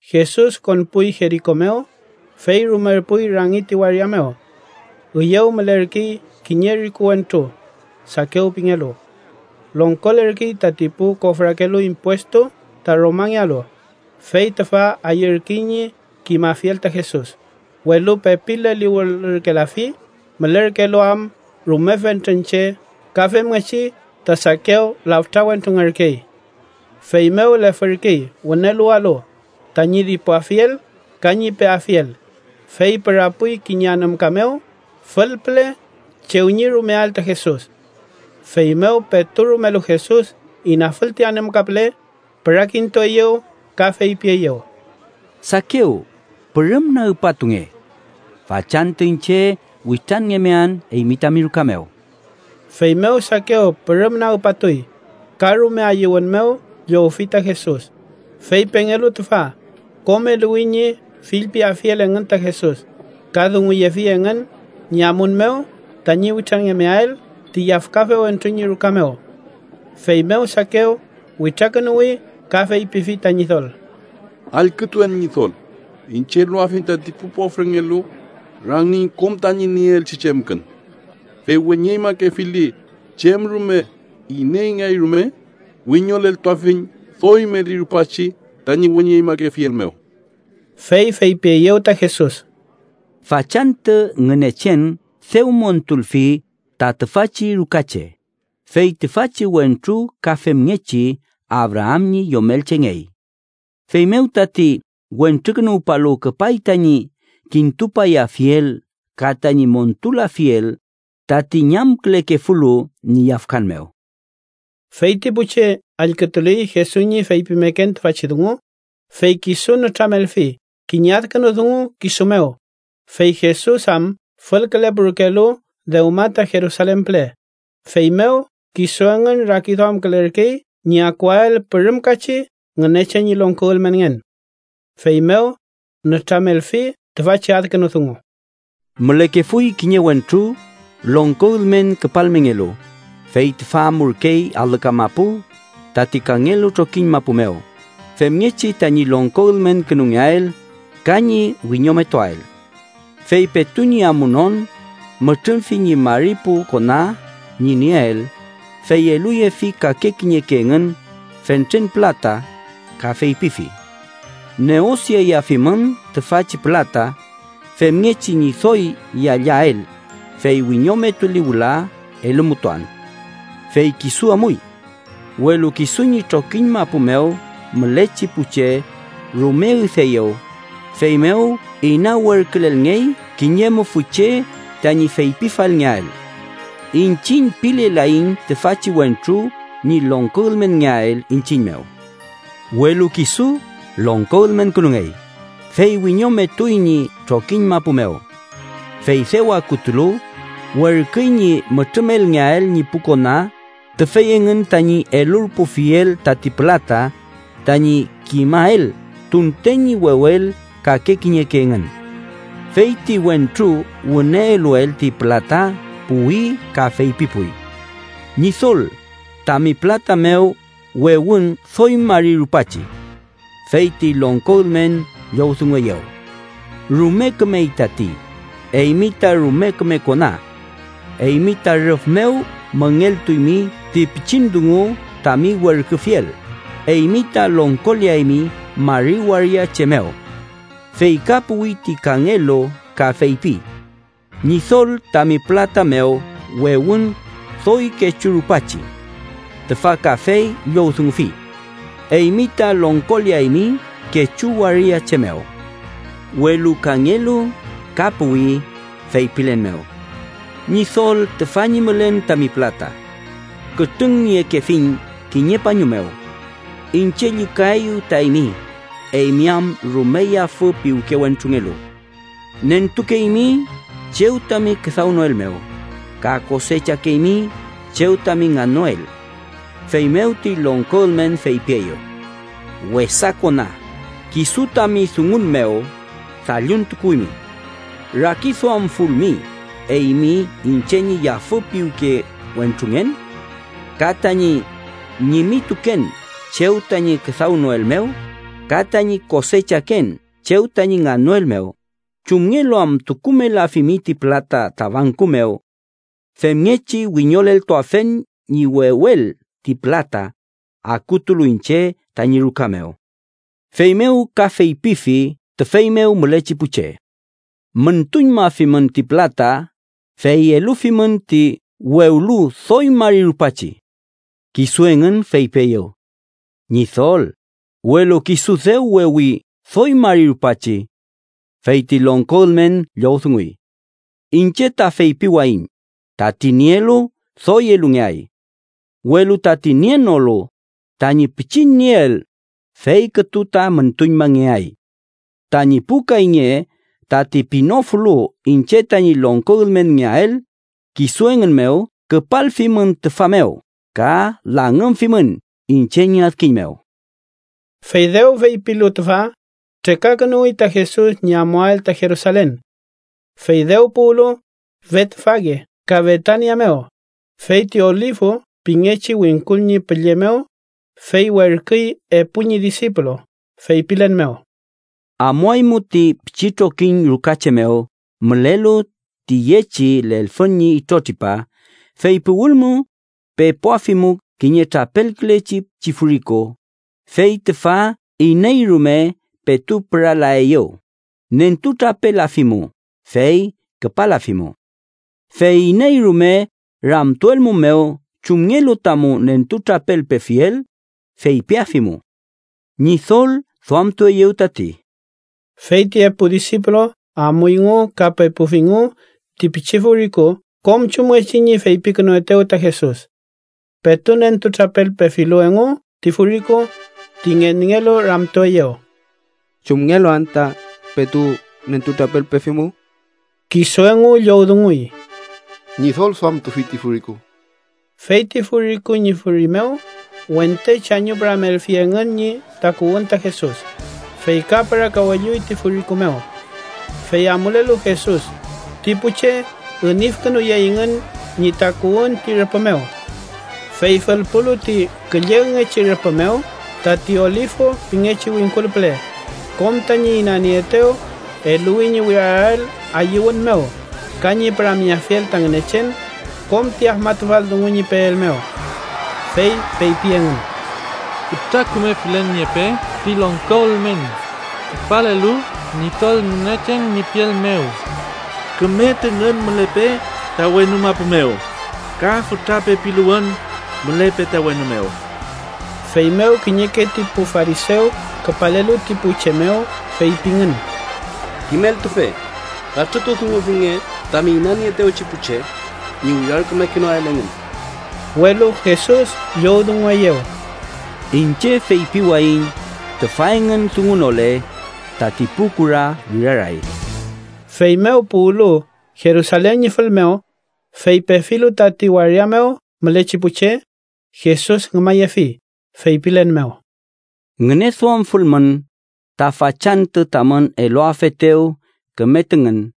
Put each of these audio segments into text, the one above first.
Jesus konpuy Jeriko mew, fey rumerpuy rangi ti waria mew. Üyew mülerkey kiñe riku wentru, Sakew pingelu. Longkolerkey tati pu kofrakelu impuestu ta Romangealu, fey tüfa ayürkey ñi kimafiel ta Jesus, welu pepi leliwülürkelafi mülerkelu am rume fentren che ka femngechi ta Sakew laftra wentrungerkey. Feymew lefürkey wünelualu, tañi dipuafiel ka ñi peafiel, fey pürapuy kiñe anümka mew fülpüle chew ñi rumeael ta Jesus. Feymew petu rumelu Jesus inafül ti anümka püle, pürakintueyew ka feypieyew: —Sakew, pürüm nagpatunge. Fachantü iñche witranngemean eymi tami ruka mew. Feymew Sakew pürüm nagpatuy, ka rume ayüwün mew llowfi ta Jesus. Fey pengelu tüfa, kom eluwi ñi fillpiafiel engün ta Jesus, ka dunguyefi engün ñi amun mew tañi witranngemeael ti yafkafe wentru ñi ruka mew. Feymew Sakew witrakünuwi ka feypifi ta Ñidol: —Allkütuen, Ñidol, iñche eluafiñ tati pu pofrengelu rangiñ kom tañi nieelchi chemkün: fey weñeñmakefili chem rume ineyngeay rume, wiñoleltuafiñ doy meli rupachi tañi weñeñmakefiel mew. Fey feypieyew ta Jesus: —Fachantü Ngünechen dew montulfi ta tüfachi rukache, fey tüfachi wentru ka femngechi Abraam ñi yomelchengey. Feymew tati Wentrukünuwpalu küpay tañi kintupayafiel ka tañi montulafiel tati ñamkülekefulu ñi yafkan mew. Fey ti pu che allkütuley Jesus ñi feypimeken tüfachi dungu, fey kisu nütramelfi kiñe adkünu dungu kisu mew, fey Jesus am fülkülepurkelu dewma ta Jerusalen püle, feymew kisu engün rakiduamkülerkey ñi akuael pürümkachi Ngünechen ñi longko ülmenngen. Feymew nütramelfi tüfachi adkünu dungu: “Mülekefuy kiñe wentru longko ülmen küpalmengelu, fey tüfa amurkey alü kamapu, tati kangelu trokiñ mapu mew, femngechi tañi longko ülmenkünungeael ka ñi wiñometuael. Fey petu ñi amunon, mütrümfi ñi mari pu kona ñi nieel, fey eluyefi kake kiñeke engün fentren pülata, ka feypifi: ‘Neosiayafimün tüfachi pülata femngechi ñi doy yallael, fey wiñometuli wüla elumutuan’. Fey kisu amuy. Welu kisu ñi trokiñ mapu mew mülechi pu che rume üdeeyew, feymew ina werkülelngey kiñe mufü che tañi feypifalngeael: ‘Iñchiñ pilelaiñ tüfachi wentru ñi longko ülmenngeael iñchiñ mew.’ “Welu kisu longko ülmenkünungey, fey wiñometuy ñi trokiñ mapu mew. Fey dew akutulu, werküy ñi mütrümelngeael ñi pu kona tüfey engün tañi elurpufiel tati pülata, tañi kimael tunten ñi wewel kake kiñeke engün. Fey ti wentru wüne eluel ti pülata puwi ka feypipuy: ‘Ñidol, tami pülata mew wewün doy mari rupachi.’ Fey ti longko ülmen llowdungueyew: ‘Rume kümey tati, eymi ta rume küme kona. Eymi ta rüf mew müngeltuymi ti pichin dungu tami werküfiel, eymi ta longkoleaymi mari waria che mew.’ Fey ka puwi ti kangelu ka feypi: ‘Ñidol, tami pülata mew wewün doy kechu rupachi.’ Tüfa kafey llowdungufi: ‘Eymi ta longkoleaymi kechu waria che mew.’ “Welu kangelu ka puwi feypilen mew: ‘Ñidol, tüfa ñi mülen tami pülata. Kütrüngniekefuiñ kiñe pañu mew: Iñche llükaeyu ta eymi, eymi am rume yafü piwke wentrungelu. Nentukeymi chew tami küdawnoel mew, ka kosechakeymi chew tami ngannoel.’ Feymew ti longko ülmen feypieyew: ‘Wesa kona, kisu tami dungun mew dalluntukuwimi. Rakiduamfulmi eymi iñche ñi yafü piwke wentrungen ka tañi ñimituken chew tañi küdawnoel mew ka tañi kosechaken chew tañi ngannoel mew, ¿chumngelu am tukumelafimi ti pülata ta banku mew? Femngechi wiñoleltuafen ñi wewel ti pülata, akutulu iñche tañi ruka mew.’ Feymew ka feypifi tüfey mew mülechi pu che: ‘Müntuñmafimün ti pülata fey elufimün ti wewlu doy mari rupachi.’ Kisu engün feypieyew: ‘Ñidol, ¡Welu kisu dew wewi doy mari rupachi!’ Fey ti longko ülmen llowdunguy: ‘Iñche ta feypiwayiñ, tati nielu doy elungeay. Welu tati nienolu, tañi pichin nieel, fey kütu ta müntuñmangeay. Tañi pu kayñe tati pinofulu iñche tañi longko ülmenngeael kisu engün mew küpalfimün tüfa mew ka langümfimün iñche ñi adkiñ mew.’” Fey dew feypilu tüfa, trekakünuwi ta Jesus ñi amuael ta Jerusalen. Fey dew puwlu Betfage ka Betania mew, feyti Olifu pingechi wingkul ñi pülle mew, fey werküy epu ñi disipulu feypilen mew: —Amuaymu ti pichi trokiñ ruka che mew mülelu tüyechi lelfün ñi itrotripa, fey puwülmu, pepuafimu kiñe trapelkülechi pichi furiku, fey tüfa iney rume petu püralaeyew, nentutrapelafimu, fey küpalafimu. Fey iney rume ramtuelmumew chumngelu tamu nentutrapelpefiel, feypiafimu ‘Ñidol duamtueyew tati’. Fey ti epu disipulu amuyngu ka pepufingu ti pichi furiku kom chumngechi ñi feypikünuetew ta Jesus. Petu nentutrapelpefilu engu ti furiku, ti ngenngelu ramtueyew: —¿Chumngelu anta petu nentutrapelpefimu? Kisu engu llowdunguy: —Ñidol duamtufi ti furiku. Fey ti furiku ñi furi mew wente chañupüramelfi engün ñi takuwün ta Jesus, fey ka pürakawelluy ti furiku mew. Fey amulelu Jesus, ti pu che inüfkünuyeyngün ñi takuwün ti rüpü mew. Fey fülpulu ti küllegngechi rüpü mew tati Olifu pingechi wingkul püle, kom tañi inanieetew eluwi ñi wirarael ayüwün mew ka ñi püramyeafiel ta Ngünechen kom ti afmatufal dungu ñi peel mew. Fey feypi engün: “¡Fütra küme felen niepe ti longko ülmen küpalelu Ñidol Ngünechen ñi piel mew! ¡Küme tüngün mülepe ta wenu mapu mew ka fütra pepiluwün mülepe ta wenu mew!” Feymew kiñeke ti pu farisew küpalelu ti pu che mew feypingün: —Kimeltufe, katrütudungufinge tami inanieetewchi pu che ñi wirarkümekenoael engün. Welu Jesus llowdungueyew: —Iñche feypiwayiñ tüfa engün dungunole, tati pu kura wiraray. Feymew puwlu Jerusalen ñi fül mew, fey pefilu tati waria mew mülechi pu che, Jesus ngümayefi feypilen mew: “¡Ngüneduamfulmün, ta fachantü tamün eluafetew küme tüngün!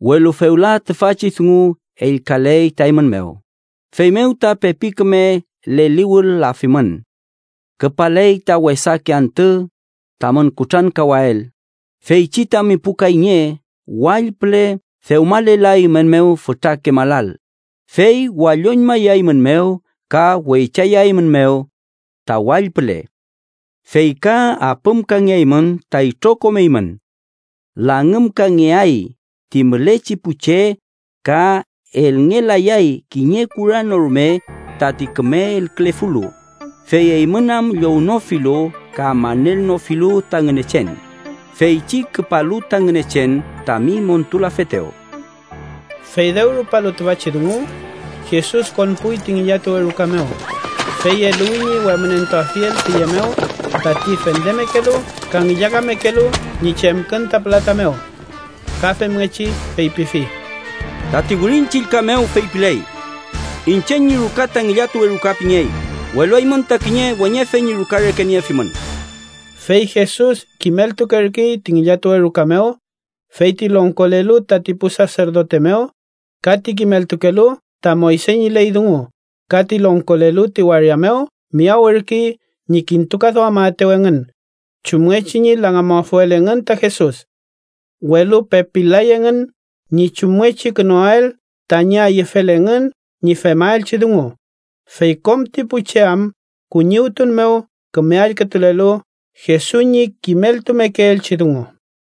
Welu fewla tüfachi dungu ellkaley ta eymün mew, feymew ta pepi küme leliwül-lafimün. Küpaley ta wesake antü tamün kutrankawael, feychi tami pu kayñe wall püle dewmalelaeymünmew fütrake malal, fey walloñmayaeymünmew ka weychayaeymünmew ta wall püle. Fey ka apümkangeaymün ta itrokom eymün. Langümkangeay ti mülechi pu che ka elngelayay kiñe kura no rume tati küme elkülefulu, fey eymün am llownofilu ka manelnofilu ta Ngünechen, feychi küpalu ta Ngünechen tami montulafetew.” Fey dew rupalu tüfachi dungu, Jesus konpuy ti ngillatuwe ruka mew, fey eluwi ñi wemünentuafiel tüye mew tati fendemekelu ka ngillakamekelu ñi chemkün ta pülata mew. Ka femngechi feypifi: “Tati Wirin Chillka mew feypiley: ‘Iñche ñi ruka ta ngillatuwe ruka pingey, welu eymün ta kiñe weñefe ñi ruka reke niefimün.’” Fey Jesus kimeltukerkey ti ngillatuwe ruka mew, fey ti longkolelu tati pu saserdote mew ka ti kimeltukelu ta Moyse ñi ley dungu ka ti longkolelu ti waria mew miyawürkey ñi kintukaduamaetew engün chumngechi ñi langümafuel engün ta Jesus. Welu pepil-lay engün ñi chumngechikünuael tañi ayüfel engün ñi femaelchi dungu, fey kom ti pu che am kuñiwtun mew küme allkütulelu Jesus ñi kimeltumekeelchi dungu.